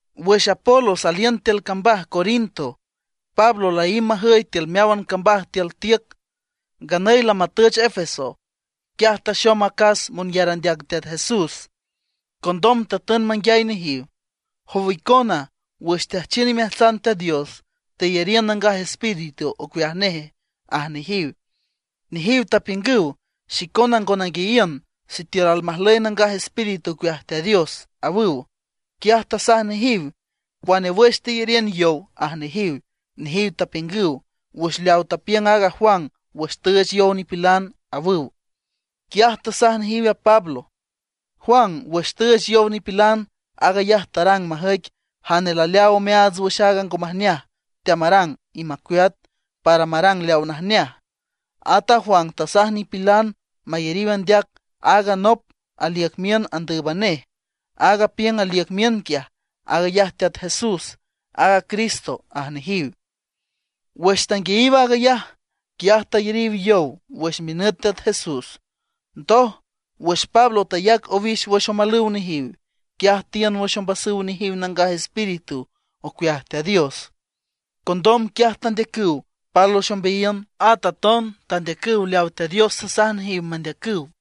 Wüx Apolos aliün tiül cambaj Corinto, Pablo laímb majüy tiül meáwan cambaj tiül tiüc; nganüy lamatüch Éfeso. Quiaj taxom acas monyar andeac Teat Jesús. Condom tatün manguiay nejiw: ―¿Jow icona, wüx teajchiün imeajtsan Teat Dios, teyariün Nangaj Espíritu ocueaj neje? ―aj nejiw. Nejiw tapiüngüw: ―Xicona ngo nanguiayiün sitiül almajlüy aaga Nangaj Espíritu ocueaj Teat Dios ―awüw. Quiaj tasaj nejiw: ―¿Cuane wüx teyariün yow? ―aj nejiw. Nejiw tapiüngüw: ―Wüx leaw tapiüng a Juan wüx tüüch yow nipilan ―awüw. Quiaj tasaj nejiw a Pablo: ―Juan wüx tüüch yow nipilan, aag ayaj tarang majüic jane laleaaw omeaats wüx aaga ngo majneaj teamarang y macueat, para marang leaw najneaj. At a Juan tasaj nipilan mayariw andeac aaga nop aliüc miün andǘüban nej. Aaga apiüng aliüc miün quiaj, aag ayaj Teat Jesús, aaga Cristo ―aj nejiw. Wüx tanguiayiw aag ayaj, quiaj tayariw yow wüx minüt Teat Jesús. Ndoj, wüx Pablo tayac owix wüx omalüw nejiw, quiaj tiün wüx ombasüw nejiw Nangaj Espíritu ocueaj Teat Dios. Condom quiaj tandeacüw pálwüx ombeayiün. At aton tandeacüw leaw Teat Dios tasaj nejiw mandeacüw.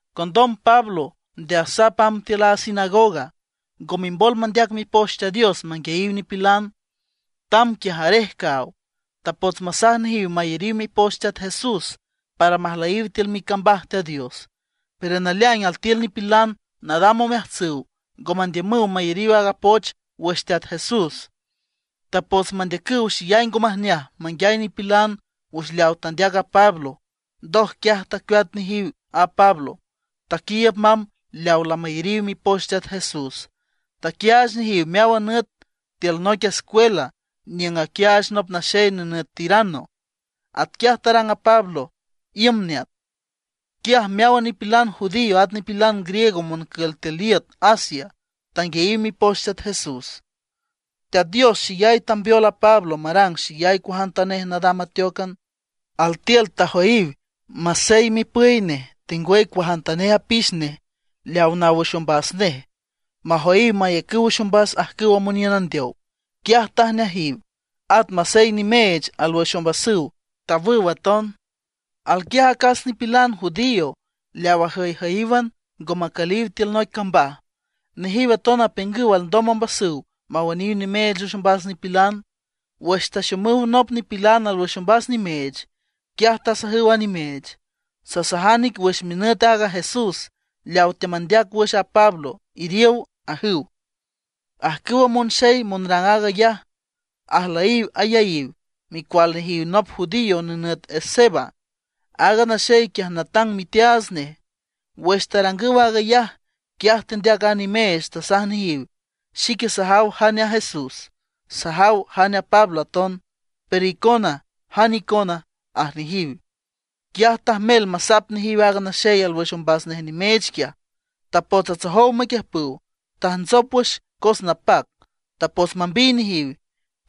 Condom Pablo nde asap amb tiül a sinagoga. Ngo mimbol mandeac Mipoch Teat Dios manguiayiw nipilan; tamb quiaj arej caaw. Tapots masaj nejiw mayariw mipoch Teat Jesús para majlüyiw tiül micambaj Teat Dios. Pero naleaing altiül nipilan nadam omeajtsüw ngo mandiümüw mayariw aaga poch wüx Teat Jesús. Tapots mandeacüw xeyay ngo majneaj manguiay nipilan wüx leaw tandeac a Pablo. Ndoj quiaj tacueat nejiw a Pablo, taquiiüb mamb leaw lamayariw mipoch Teat Jesús; taquiaach nejiw meáwan nüt tiül noic escuela niüng aquiaach nop naxey nenüt Tiranno. Atquiaj tarang a Pablo iüm neat. Quiaj meáwan nipilan judío at nipilan griego moncül tiül iüt Asia tanguiayiw mipoch Teat Jesús. Teat Dios xeyay tambeol a Pablo marang xeyay cuajantanej nadam ateócan. Altiül tajoyiw masey mipüy nej, tengwüy cuajantanej apix nej leaw naw wüx ombas nej, majoyiw mayacüw wüx ombas ajcüwa moniün andeow, quiaj tajneajiw; at masey nimeech alwüx ombasüw, tawüw aton. Alquiaj acas nipilan judío leaw ajüyjüyíwan, ngo macüliw tiül noic cambaj. Nejiw aton apiüngüw alndom ombasüw mawüniw nimeech wüx ombas nipilan. Wüx taxomüw nop nipilan alwüx ombas nimeech, quiaj tasajüw a nimeech: ―Sasajan ic wüx minüt aaga Jesús, leawa teamandeac wüx a Pablo, iriow ―ajüw. Ajcüwa monxey monrang aag ayaj, ajlüyiw ayaíw, micual nejiw nop judío nenüt Esceva. Aaga naxey quiaj natang miteaats nej. Wüx tarangüw aag ayaj, quiaj tendeac a nimeech, tasaj nejiw: ―Xique sajaw jane a Jesús, sajaw jane a Pablo aton; pero icona ¿jane icona? ―aj nejiw. Quiaj tajmel masap nejiw aaga naxey alwüx ombas nej nimeech quiaj. Tapots atsojow maquiüjpüw. Tajntsop wüx cos napac, tapots mambiy nejiw.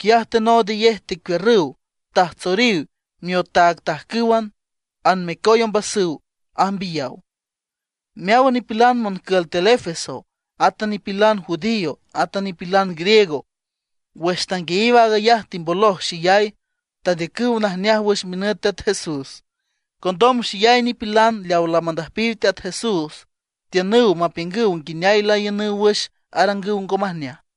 Quiaj tenoodayej tecuiürrüw tajtsoriw miotaagtajcǘwan, anmecoy ombasüw ajmbiyaw. Meáwan nipilan moncül tiül Éfeso, átan nipilan judío átan nipilan griego, wüx tanguiayiw aag ayaj timboloj xeyay. Tandeacüw najneaj wüx minüt Teat Jesús. Condom xeyay nipilan leaw lamandüjpiw Teat Jesús tiünüw mapiüngüw nguineay laiünüw wüx arangüw ngo majneaj.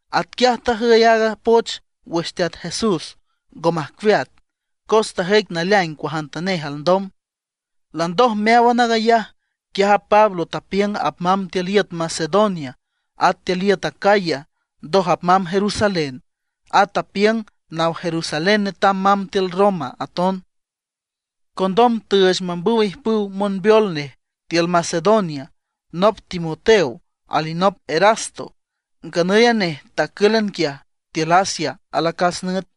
Atquiaj tajüy aaga poch wüx Teat Jesús, ngo majcueat, cos tajüic naleaing cuajantanej alndom. Landoj meáwan aag ayaj, quiaj a Pablo tapiüng apmamb tiül iüt Macedonia at tiül iüt Acaya, ndoj apmamb Jerusalén. At tapiüng naw Jerusalén netam mamb tiül Roma aton. Condom tüüch mambüw ijpüw monbeol nej tiül Macedonia: nop Timoteo alinop Erasto; nganüy a nej tacǘlan quiaj tiül Asia alacas nüt.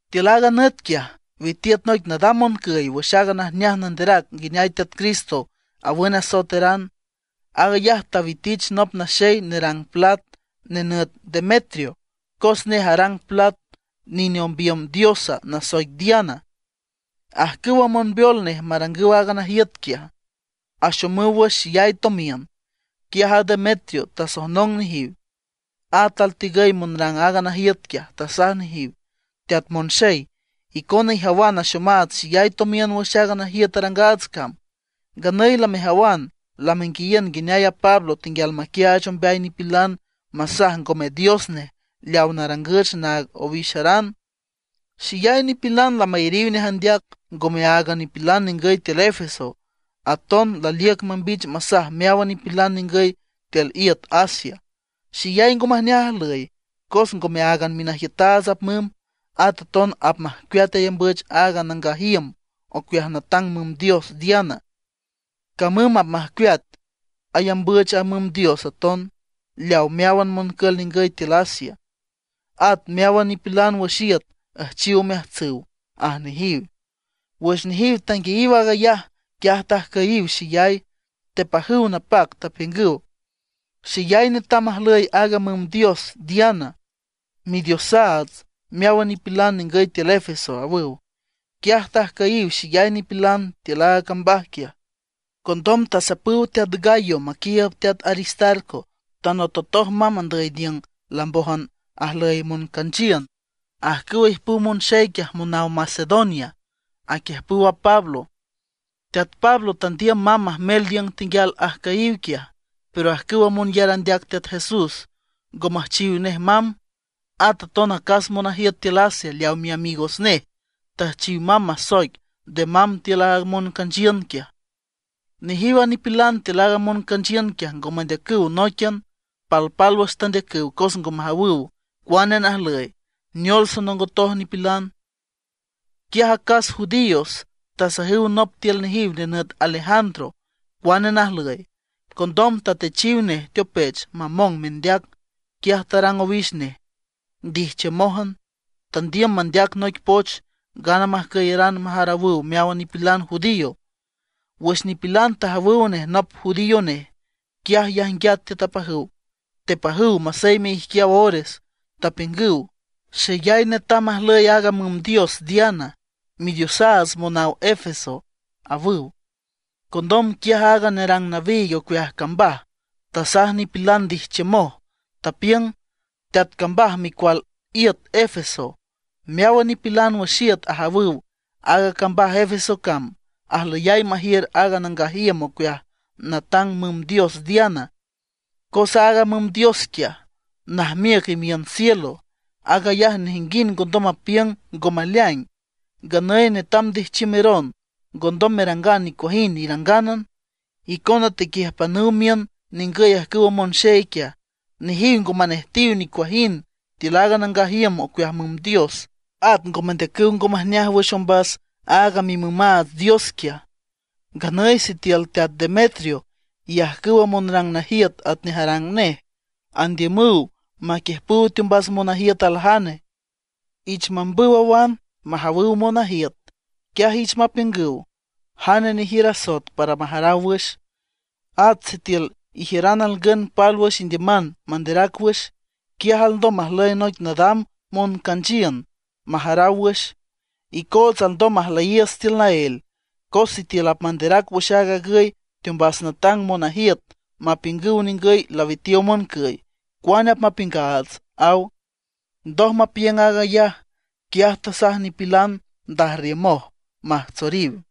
Tiül aaga nüt quiaj, witiüt noic nadam moncüy wüx aaga najneaj nanderac nguineay Teat Cristo awün asoeteran. Aag ayaj tawitich nop naxey nerang plat, nenüt Demetrio, cos nej arang plat nine ombiüm diosa nasoic Diana. Ajcüw monbeol nej marangüw aaga najiüt quiaj, axomüw wüx xeyay tomiün. Quiaj a Demetrio tasojnong nejiw, at altigüy monrang aaga najiüt quiaj, tasaj nejiw: ―Teat monxey, icona ijawan axomaats xeyay tomiün wüx aaga najiüt arangaats cam. Nganüy lamejawan lamenguiayiün nguineay aaga Pablo tenguial maquiaach ombeay nipilan masaj ngome dios nej leaw narangüch naag owixaran. Xeyay nipilan lamayariw nej andeac, ngome áagan nipilan ningüy tiül Éfeso, aton laliüc mambich masaj meáwan nipilan ningüy tiül iüt Asia. Xeyay ngo majneaj ajlüy, cos ngome áagan minajiütaats apmümb, at aton apmajcueat ayambüch aaga nangaj iüm ocueaj natang müm dios Diana, camüm apmajcueat ayambüch a müm dios aton, leaw meáwan moncül ningüy tiül Asia, at meáwan nipilan wüx iüt üjchiw omeajtsüw ―aj nejiw. Wüx nejiw tanguiayiw aag ayaj, quiaj tajcüyiw xeyay, tepajüw napac, tapiüngüw: ―¡Xeyay netam ajlüy aaga müm dios Diana, midiosaats meáwan nipilan ningüy tiül Éfeso! ―awüw. Quiaj tajcüyiw xeyay nipilan tiül aaga cambaj quiaj. Condom tasapüw teat Gayo maquiiüb teat Aristarco, tanototoj mamb andüy niüng lambójan ajlüy moncanchiün. Ajcüwa ijpüw monxey quiaj monaw Macedonia, aquiüjpüw a Pablo. Teat Pablo tandiüm mamb majmel niüng tenguial ajcüyiw quiaj, pero ajcüwa monyar andeac Teat Jesús ngo müjchiw nej mamb. At aton acas monajiüt tiül Asia leaw miamigos nej, tüjchiw mamb masoic nde mamb tiül a moncanchiün quiaj. Nejiw a nipilan tiül aaga moncanchiün quiaj ngo mandeacüw nóiquian, palpálwüx tandeacüw cos ngo majawüw cuane najlüy, neol sonongot nipilan. Quiaj acas judíos tasajüw nop tiül nejiw nenüt Alejandro cuane najlüy. Condom tatechiw nej teopech mamong mendeac. Quiaj tarang owix nej ndijchiümójan. Tandiüm mandeac noic poch ngana majcüyaran majarawüw meáwan nipilan judío. Wüx nipilan tajawüw nej nop judío nej, quiaj yajnguiat tiüt apajüw, tepajüw maseyme ijquiaw ores, tapiüngüw: ―¡Xeyay netam ajlüy aaga müm dios Diana, midiosaats monaw Éfeso! ―awüw. Condom quiaj aaga nerang nawiig ocueaj cambaj, tasaj nipilan ndijchiümoj. Tapiüng: ―Teat cambaj micual iüt Éfeso, meáwan nipilan wüx iüt ajawüw aaga cambaj Éfeso cam ajlüyay majiür aaga nangaj iüm ocueaj natang müm dios Diana. Cos aaga müm dios quiaj, najmiüc imiün cielo. Aag ayaj nejinguind ngondom mapiüng ngo maleaing. Nganüy netam ndijchiümeron, ngondom merangan nicuajind irangánan. Icona tequiüjpanüw miün ningüy ajcüwa monxey quiaj; nejiw ngo manejtiw nicuajind tiül a nangaj iüm ocueaj müm dios; at ngo mandeacüw ngo majneaj wüx ombas aaga mimümaats dios quiaj. Nganüy sitiül teat Demetrio y ajcüwa monrang najiüt atnej arang nej, andiümüw maquiüjpüw teombas monajiüt aljane, ich mambüw awan majawüw monajiüt. Quiaj ich mapiüngüw jane nejiür asoet para majaraw wüx. At sitiül ijiüran alngün pálwüx indiüman manderac wüx, quiaj alndom majlüy noic nadam moncanchiün majaraw wüx. Icootsa alndom majlüyiiüts tiül naél; cos sitiül apmanderac wüx aag agüy teombas natang monajiüt mapiüngüw ningüy lawitiow moncüy, cuane apmapiüngaats ―aw. Ndoj mapiüng aag ayaj, quiaj tasaj nipilan ndajrriümoj majtsoriw.